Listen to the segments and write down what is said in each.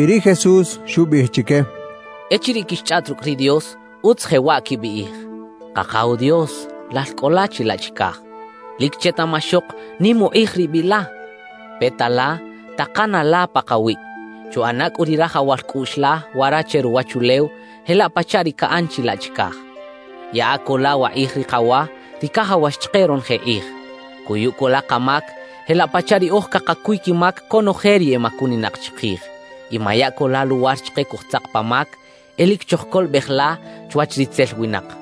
Y ri Jesús xubiꞌij chique: —Echiriꞌ quixchꞌaꞌt rucꞌ ri Dios, utz jewaꞌ quibiꞌij: Kakaw Dios, Lal cꞌo la chilaꞌ chicaj, ¡lic chetaꞌmaxok nim ukꞌij ri biꞌ la! Peta la, takana la pakawiꞌ; chuꞌana cꞌu ri rajawal cꞌuꞌx la wara che ruwachulew, jelaꞌ pachaꞌ ri caꞌan chilaꞌ chicaj. Yaꞌa co la wakꞌij ri kawa, ri cajawax chike ronoje kꞌij. Cuyu co la kamac, jelaꞌ pachaꞌ riꞌoj cakacuy quimac conoje ri emacuninak chikij. Y maya co la luwar chike cojtzak pa mac; e lic chojcolobej la chwach ritzel winak —xchaꞌ.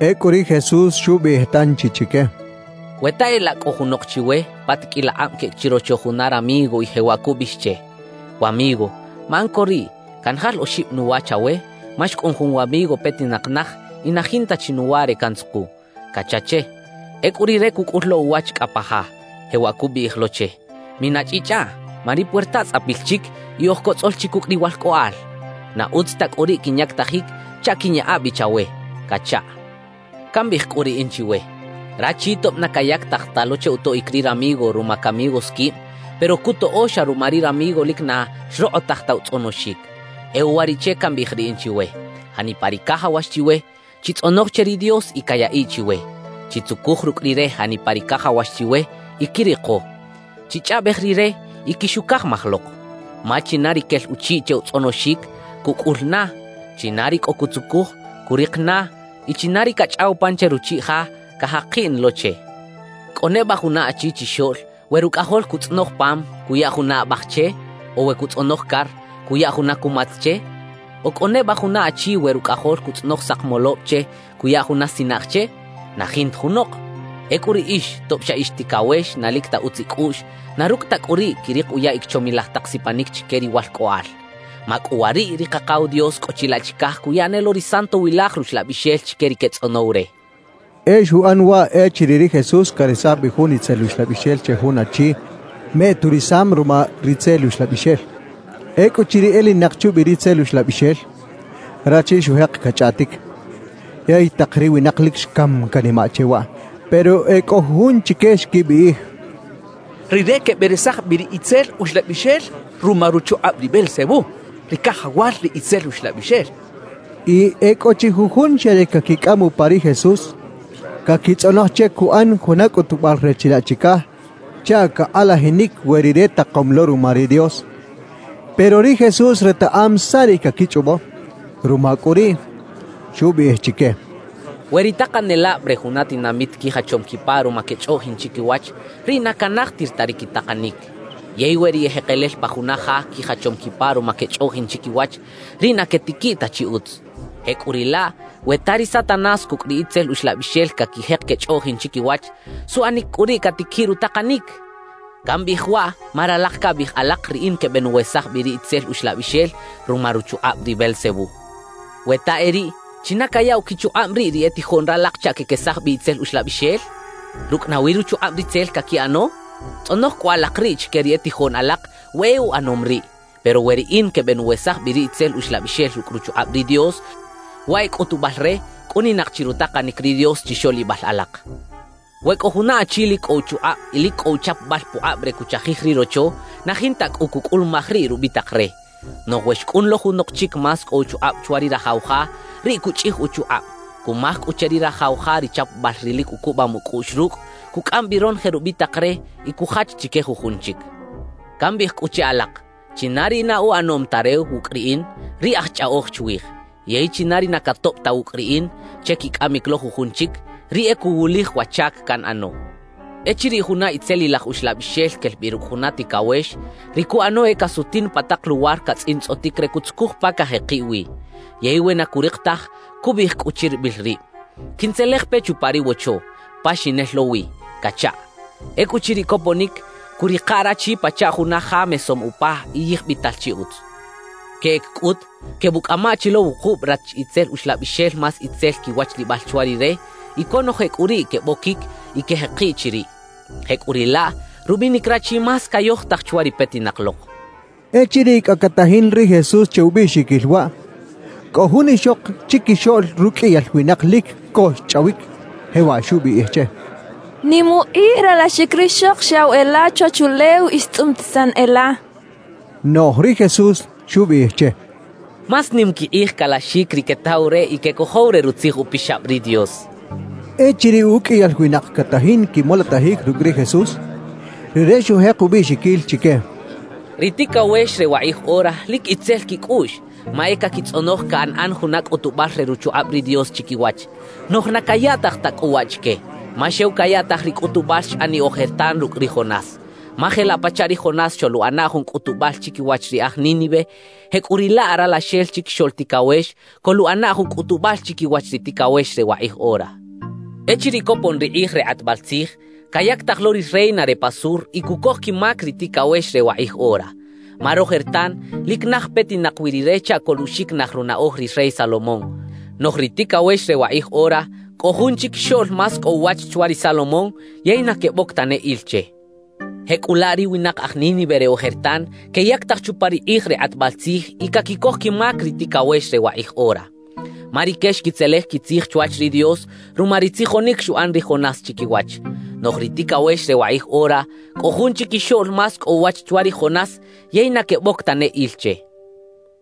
Ecꞌu ri Jesús xubiꞌij tanchi chique: «We ta e laꞌ cꞌo junok chiwe, pa tiqꞌuil akꞌab queꞌec chirocho juna ramigo y jewaꞌ cubiꞌij che: “Wamigo, maꞌan co riꞌ canjal oxib nuwa chawe, ma xcꞌun jun wamigo petinak naj y na jinta chi nuwa re cantzuku” cacha che. »Ecꞌu rire cucꞌul lo uwach cꞌa pa ja, jewaꞌ cubiꞌij lo che: “Minachꞌichꞌaꞌ, ma ri puerta tzꞌapil chic y oj cotzꞌol chi cucꞌ ri walcꞌoꞌal. Na utz ta cꞌu riꞌ quinyactajic chaꞌ quiꞌnyaꞌa bi chawe” cachaꞌ. »Cambiꞌij cꞌu riꞌin chiwe: Rachi tob na cayactaj ta lo che utoꞌic ri ramigo ruma camigos quib, pero cutoꞌo xa ruma ri ramigo lic na xrokꞌotaj ta utzꞌonoxic. E uwariꞌche cambiꞌij riꞌin chiwe: Janipa ri cajawax chiwe, chitzꞌonoj che ri Dios y cayaꞌiꞌ chiwe; chitzucuj rucꞌ Rire janipa ri cajawax chiwe y quiriko; chichꞌaꞌbej Rire y quixucajmaj lok. Ma china ri quel uchiꞌ che utzꞌonoxic, cucꞌul na; china ri cꞌo cutzucuj, curik na; y china ri cachꞌaw pan che ruchiꞌ ja, cajakiꞌ na lo che. »¿Cꞌo neba juna achi chixoꞌl, we rucꞌajol cutzꞌonoj pam, cuya juna abaj che; o we cutzꞌonoj car, cuya juna cumatz che? ¿O cꞌo neba juna achi we rucꞌajol cutzꞌonoj sakmolob che, cuya juna sinaꞌj che? ¡Na jinta junok! Ecꞌu riꞌix tob xa ix ticawex na lic ta utz icꞌuꞌx, na rucꞌ ta cꞌu riꞌ, quirik uyaꞌic chomilaj tak sipanic chique riwalcꞌoꞌal. ¡Macꞌuwariꞌ ri Kakaw Dios cꞌo chilaꞌ chicaj cuya ne lo ri Santowilaj Ruxlabixel chique ri quetzꞌonow re!» xcha ri Jesús. E xuꞌan waꞌ echiriꞌ ri Jesús caresaj bi jun itzel uxlabixel che jun achi meꞌturisam ruma ri itzel uxlabixel. Ecꞌuchiriꞌ elinak chubi ri itzel uxlabixel, rachi xujek cachꞌaꞌtic. Yey tak ri winak lic xcam canimaꞌ che waꞌ. Pero e cꞌo jujun chique xquibiꞌij: «Rire queberesaj bi ri itzel uxlabixel ruma ruchukꞌab ri Beelzebú, ri cajawal ri itzel uxlabixel» xechaꞌ. Y e cꞌo chi jujun xa re caquicꞌam upa ri Jesús, caquitzꞌonoj che cuꞌan juna cꞌutubal re chilaꞌ chicaj chaꞌ cakꞌalajinic we Rire takom lo ruma ri Dios. Pero ri Jesús retaꞌam saꞌ ri caquichꞌobo; ruma cꞌu riꞌ, xubiꞌij chique: «We ri takanelab re juna tinamit quijachom quipa ruma quechꞌoꞌjin chiquiwach, riꞌ na canajtir ta ri quitakanic. Yey we ri ejekelel pa juna ja quijachom quipa ruma quechꞌoꞌjin chiquiwach, riꞌ na quetiquiꞌ ta chi utz. Jecꞌuriꞌlaꞌ, we ta ri Satanás cucꞌ ri itzel uxlabixel caquijek quechꞌoꞌjin chiquiwach, ¿suꞌanic cꞌu riꞌ catiquiꞌ rutakanic? Cambiꞌij waꞌ ma ralak cabiꞌij alak riꞌin quebenuwesaj bi ri itzel uxlabixel ruma ruchukꞌab ri Beelzebú. »We ta e riꞌ, ¿china cayaꞌw quichukꞌab riꞌ ri e tijoꞌn ralak chaꞌ quequesaj bi itzelilaj uxlabixel? ¿Rucꞌ nawi ruchukꞌab ritzel caquiꞌano? Tzꞌonoj cꞌu alak riꞌ chique ri e tijoꞌn alak we e uꞌanom riꞌ. Pero we riꞌin quebenuwesaj bi ri itzel uxlabixel rucꞌ ruchukꞌab ri Dios, waꞌ e cꞌutubal re cꞌuninak chi rutakanic ri Dios chixoꞌlibal alak. »We cꞌo juna achi lic cꞌo uchukꞌab y lic cꞌo uchapabal pukꞌab re cuchajij ri rocho, na jinta cꞌu cucꞌulumaj riꞌ rubitak re. Noꞌj we xcꞌun lo junok chic más cꞌo uchukꞌab chwa ri rajaw ja, riꞌ cuchꞌij uchukꞌab, cumaj cꞌu che ri rajaw ja ri chapabal ri lic ucubam ucꞌuꞌx rucꞌ, cucꞌam bi ronoje rubitak re y cujach chique jujun chic. Cambiꞌij cꞌu che alak: China ri na uꞌanom ta re wucꞌ riꞌin, riꞌ aj chꞌaꞌoj chwij. Yey china ri na catoꞌb ta wucꞌ riꞌin che quicꞌamic lo jujun chic, riꞌ e cuwulij wa chac canꞌano. »Echiriꞌ juna itzelilaj uxlabixel quel bi rucꞌ juna ticawex, ri cuꞌano e casutin pa tak luwar catzꞌintzꞌotic re cutzucuj pa cajekiꞌ wi. Yey we na curik taj, cubiꞌij cꞌu chiribil rib: “Quintzelej pe chupa ri wocho, pa xinel lo wi” cachaꞌ. Ecꞌuchiriꞌ coponic, cuꞌrika rachi pachaꞌ juna ja mesom upa y yijbital chi utz. Queꞌec cꞌut, quebuꞌcꞌama chi lo wukub rach itzel uxlabixel más itzel quiwachlibal chwa rire; y conoje cꞌu riꞌ queboquic y quejekiꞌ chiriꞌ. Jecꞌuriꞌlaꞌ, rubinic rachi más cayojtaj chwa ri petinak lok» xcha ri Jesús. Echiriꞌ cꞌa catajin ri Jesús che ubiꞌxiquil waꞌ, cꞌo jun ixok chiquixoꞌl ruqꞌuiyal winak lic co xchꞌawic, jewaꞌ xubiꞌij che: —Nim ukꞌij ralaxic rixok xyaꞌw e la chwachulew y xtzꞌumtisan e la —xchaꞌ. Noꞌj ri Jesús xubiꞌij che: —Más nim quikꞌij calaxic ri quetaw re y quecojow re Rutzij Upixab ri Dios —xchaꞌ. Echiriꞌ uqꞌuiyal winak catajin quimolotajic rucꞌ ri Jesús, rire xujek ubiꞌxiquil chique: «Ri ticawex re wakꞌij ora lic itzel quicꞌuꞌx, ma e caquitzꞌonoj canꞌan juna cꞌutubal re ruchukꞌab ri Dios chiquiwach. Noꞌj na cayaꞌtaj ta cꞌu waꞌ chique, ma xew cayaꞌtaj ri cꞌutubal xꞌaniꞌ ojertan rucꞌ ri Jonás. Ma jelaꞌ pachaꞌ ri Jonás xoluꞌana jun cꞌutubal chiquiwach ri aj Nínive, jecꞌuriꞌlaꞌ Ralaxel Chiquixoꞌl Ticawex coluꞌana jun cꞌutubal chiquiwach ri ticawex re wakꞌij ora. »Echiriꞌ copon ri kꞌij re kꞌatbal tzij, cayactaj lo ri reina re pa sur y cucoj quimac ri ticawex re wakꞌij ora. Ma rojertan lic naj petinak wi rire chaꞌ coluꞌxiquinaj runaꞌoj ri rey Salomón. Noꞌj ri ticawex re wakꞌij ora, cꞌo jun chiquixoꞌl más cꞌo uwach chwa ri Salomón, yey na queboc tane il che. »Jecꞌulaꞌ ri winak aj Nínive re ojertan queyactaj chupa ri kꞌij re kꞌatbal tzij y caquicoj quimac ri ticawex re wakꞌij ora. Ma rique xquitzelej quitzij chwach ri Dios ruma ri tzijonic xuꞌan ri Jonás chiquiwach. Noꞌj ri ticawex re wakꞌij ora, cꞌo jun chiquixoꞌl más cꞌo uwach chwa ri Jonás, yey na queboc tane il che.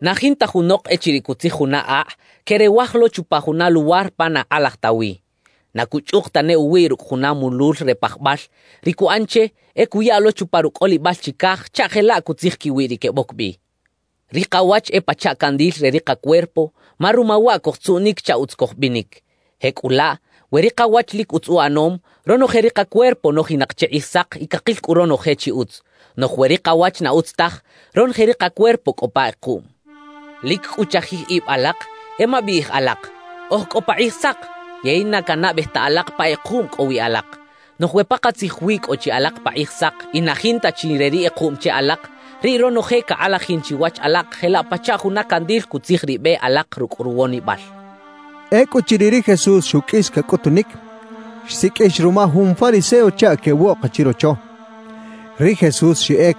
»Na jinta junok echiriꞌ cutzij juna akꞌ, queꞌrewaj lo chupa juna luwar pa na kꞌalaj ta wi. Na cuchꞌuk tane uwiꞌ rucꞌ juna mulul re pajbal; ri cuꞌan che, e cuya lo chupa rucꞌolibal chicaj chaꞌ jelaꞌ cutzij quiwiꞌ ri queboc bi. »Ri kawach e pachaꞌ candil re ri kacuerpo, ma ruma waꞌ cojtzuꞌnic chaꞌ utz cojbinic. Jecꞌulaꞌ, we ri kawach lic utz uꞌanom, ronoje ri kacuerpo nojinak che kꞌijsak y cakil cꞌu ronoje chi utz. Noꞌj we ri kawach na utz taj, ronoje ri kacuerpo cꞌo pa kꞌekuꞌm. »Lic cꞌu chajij ib alak; e mabiꞌij alak: “Oj cꞌo pa kꞌijsak”, yey na canaꞌbej ta alak pa kꞌekuꞌm cꞌo wi alak. Noꞌj we pakatzij wi cꞌo chi alak pa kꞌijsak y na jinta chi re ri kꞌekuꞌm che alak, riꞌ ronoje cakꞌalajin chiwach alak jelaꞌ pachaꞌ juna candil cutzij ri be alak rucꞌ ruwonibal» xchaꞌ. Ecꞌuchiriꞌ ri Jesús xuqꞌuis cacꞌutunic, xsiqꞌuix ruma jun fariseo chaꞌ queꞌwoꞌka chirocho. Ri Jesús xeꞌec,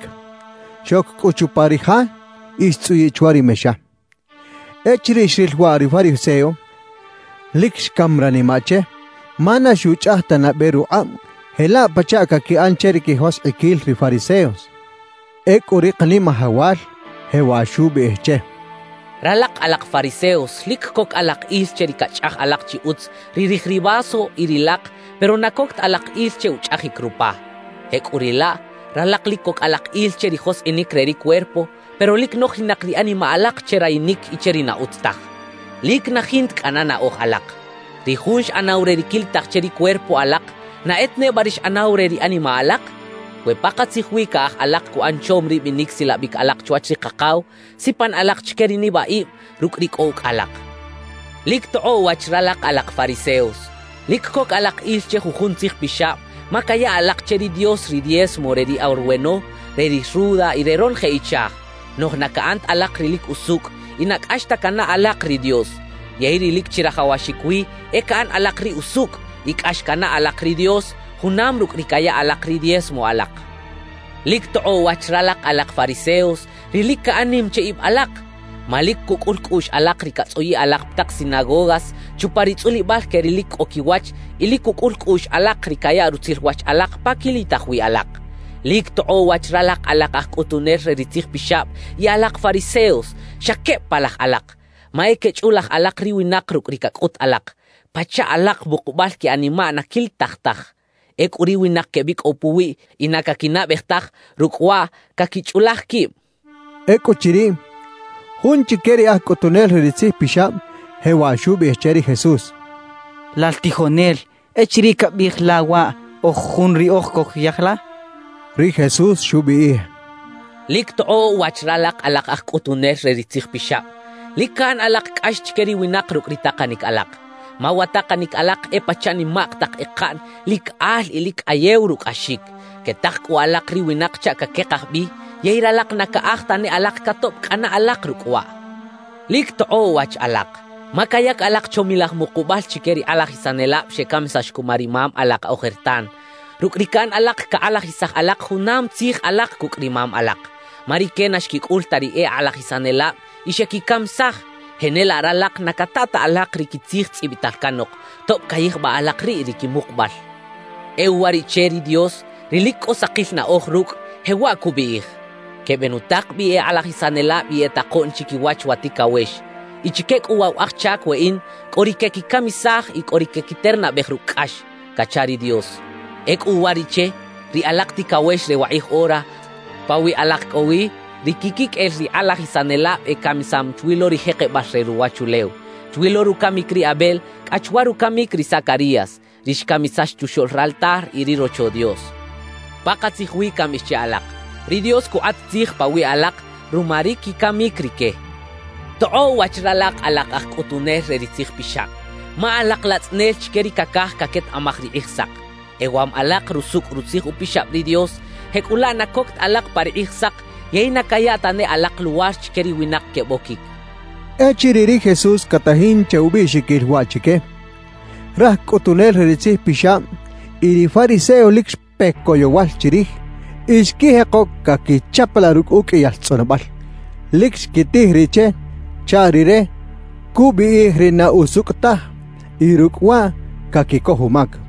xoc cꞌu chupa ri ja y xtzꞌuyiꞌ chwa ri mexa. Echiriꞌ xril waꞌ ri fariseo, lic xcam ranimaꞌ che ma na xuchꞌaj ta nabe rukꞌab jelaꞌ pachaꞌ caquiꞌan che ri quijoskꞌiquil ri fariseos. Ecꞌu ri Kanimajawal jewaꞌ xubiꞌij che: —Ralak alak fariseos lic coc alak il che ri cachꞌaj alak chi utz ri rij ri vaso y ri lak pero na coc ta alak il che uchꞌajic rupa. Jecꞌuriꞌlaꞌ ralak lic coc alak il che ri joskꞌinic re ri cuerpo, pero lic nojinak ri animaꞌ alak che rayinic y che ri na utz taj. »¡Lic na jinta cꞌana naꞌoj alak! Ri Jun xꞌanaw re ri quilitaj che ri cuerpo alak, ¿na e ta neba ri xꞌanaw re ri animaꞌ alak? We pakatzij wi caꞌaj alak cuꞌan chom ri binic silabic alak chwach ri Kakaw, sipan alak chique ri nibaꞌib rucꞌ ri cꞌo ucꞌ alak. »¡Lic tokꞌoꞌ wach ralak alak fariseos! Lic coc alak il che jujun tzijpixab, ma caya alak che ri Dios ri diezmo re ri arweno, re ri ruda y re ronoje ichaj; noꞌj na caꞌan ta alak ri lic usucꞌ y na cꞌax ta canaꞌ alak ri Dios. Yey ri lic chirajawaxic wi e caꞌan alak ri usucꞌ y cꞌax canaꞌ alak ri Dios, junam rucꞌ ri caya alak ri diezmo alak. »¡Lic tokꞌoꞌ wach ralak alak fariseos, ri lic caꞌan nim che ib alak! Ma lic cucꞌul cꞌuꞌx alak ri catzꞌuyiꞌ alak pa tak sinagogas chupa ri tzꞌulibal que ri lic cꞌo quiwach y lic cucꞌul cꞌuꞌx alak ri cayaꞌ rutzil wach alak pa quilitaj wi alak. »¡Lic tokꞌoꞌ wach ralak alak aj cꞌutunel re ri tzijpixab y alak fariseos! Xa queb palaj alak, ma e quechꞌulaj alak ri winak rucꞌ ri cacꞌut alak. Pachaꞌ alak mukubal que animaꞌ na quilitaj taj; ecꞌu ri winak quebicꞌow puwiꞌ y na caquinaꞌbej taj rucꞌ waꞌ caquichꞌulaj quib» xchaꞌ. Ecꞌuchiriꞌ, jun chique ri e aj cꞌutunel re ri tzijpixab jewaꞌ xubiꞌij che ri Jesús: —Lal tijonel, echiriꞌ cabiꞌij la waꞌ, oj jun riꞌoj cojyaj la —xchaꞌ. Ri Jesús xubiꞌij: «¡Lic tokꞌoꞌ wach ralak alak aj cꞌutunel re ri tzijpixab! Lic caꞌan alak cꞌax chique ri winak rucꞌ ri takanic alak. Ma wa takanic alak e pachaꞌ nimak tak ekaꞌn lic al y lic cꞌayew rucꞌaxic; quetak cꞌu alak ri winak chaꞌ caquekaj bi yey ralak na caꞌaj tane alak catoꞌb cꞌana alak rucꞌ waꞌ. »¡Lic tokꞌoꞌ wach alak! Ma cayac alak chomilaj mukubal chique ri kꞌalajisanelab xecamisax cuma ri mam alak ojertan. Rucꞌ ri caꞌan alak cakꞌalajisaj alak junam tzij alak cucꞌ ri mam alak. Ma rique na xquicꞌul ta ri e kꞌalajisanelab y xequicamisaj; jenelaꞌ ralak na cata ta alak ri quitzij tzꞌibital canok, tob cayijbaꞌ alak riꞌ ri quimukubal. »E uwariꞌche ri Dios, ri lic cꞌo sakil naꞌoj rucꞌ, jewaꞌ cubiꞌij: “Quebenutak bi e kꞌalajisanelab y e takoꞌn chiquiwach wa ticawex. Y chique cꞌu waꞌ wa aj chac weꞌin, cꞌo ri quequicamisaj y cꞌo ri quequiternabej rucꞌ cꞌax” cacha ri Dios. Ecꞌu uwariꞌche, ri alak ticawex re wakꞌij ora, pawiꞌ alak cꞌo wi ri quiquiqꞌuel ri kꞌalajisanelab ecamisam chwi lo ri jekebal re ruwachulew, chwi lo rucamic ri Abel cꞌa chwa rucamic ri Zacarías, ri xcamisax chuxoꞌl raltar y ri Rocho Dios. Pakatzij wi cambiꞌij che alak, ri Dios cukꞌat tzij pawiꞌ alak ruma ri quicamic rique. »¡Tokꞌoꞌ wach ralak alak aj cꞌutunel re ri tzijpixab! Ma alak latzꞌanel chique ri cacaj caquetaꞌmaj ri Kꞌijsak. Ewam alak rusucꞌ Rutzij Upixab ri Dios, jecꞌulaꞌ na coc ta alak pa ri Kꞌijsak yey na caya tane alak luwar chique ri winak queboquic» xchaꞌ. Echiriꞌ ri Jesús catajin che ubiꞌxiquil waꞌ chique, raj cꞌutunel re ri tzijpixab y ri fariseos lic xpe coyowal chirij y xquijeko caquichapalaꞌ rucꞌ uqꞌuiyal tzꞌonobal. Lic xquitij riꞌ che chaꞌ rire cubiꞌij ri na usucꞌ taj y rucꞌ waꞌ caquicoj umac.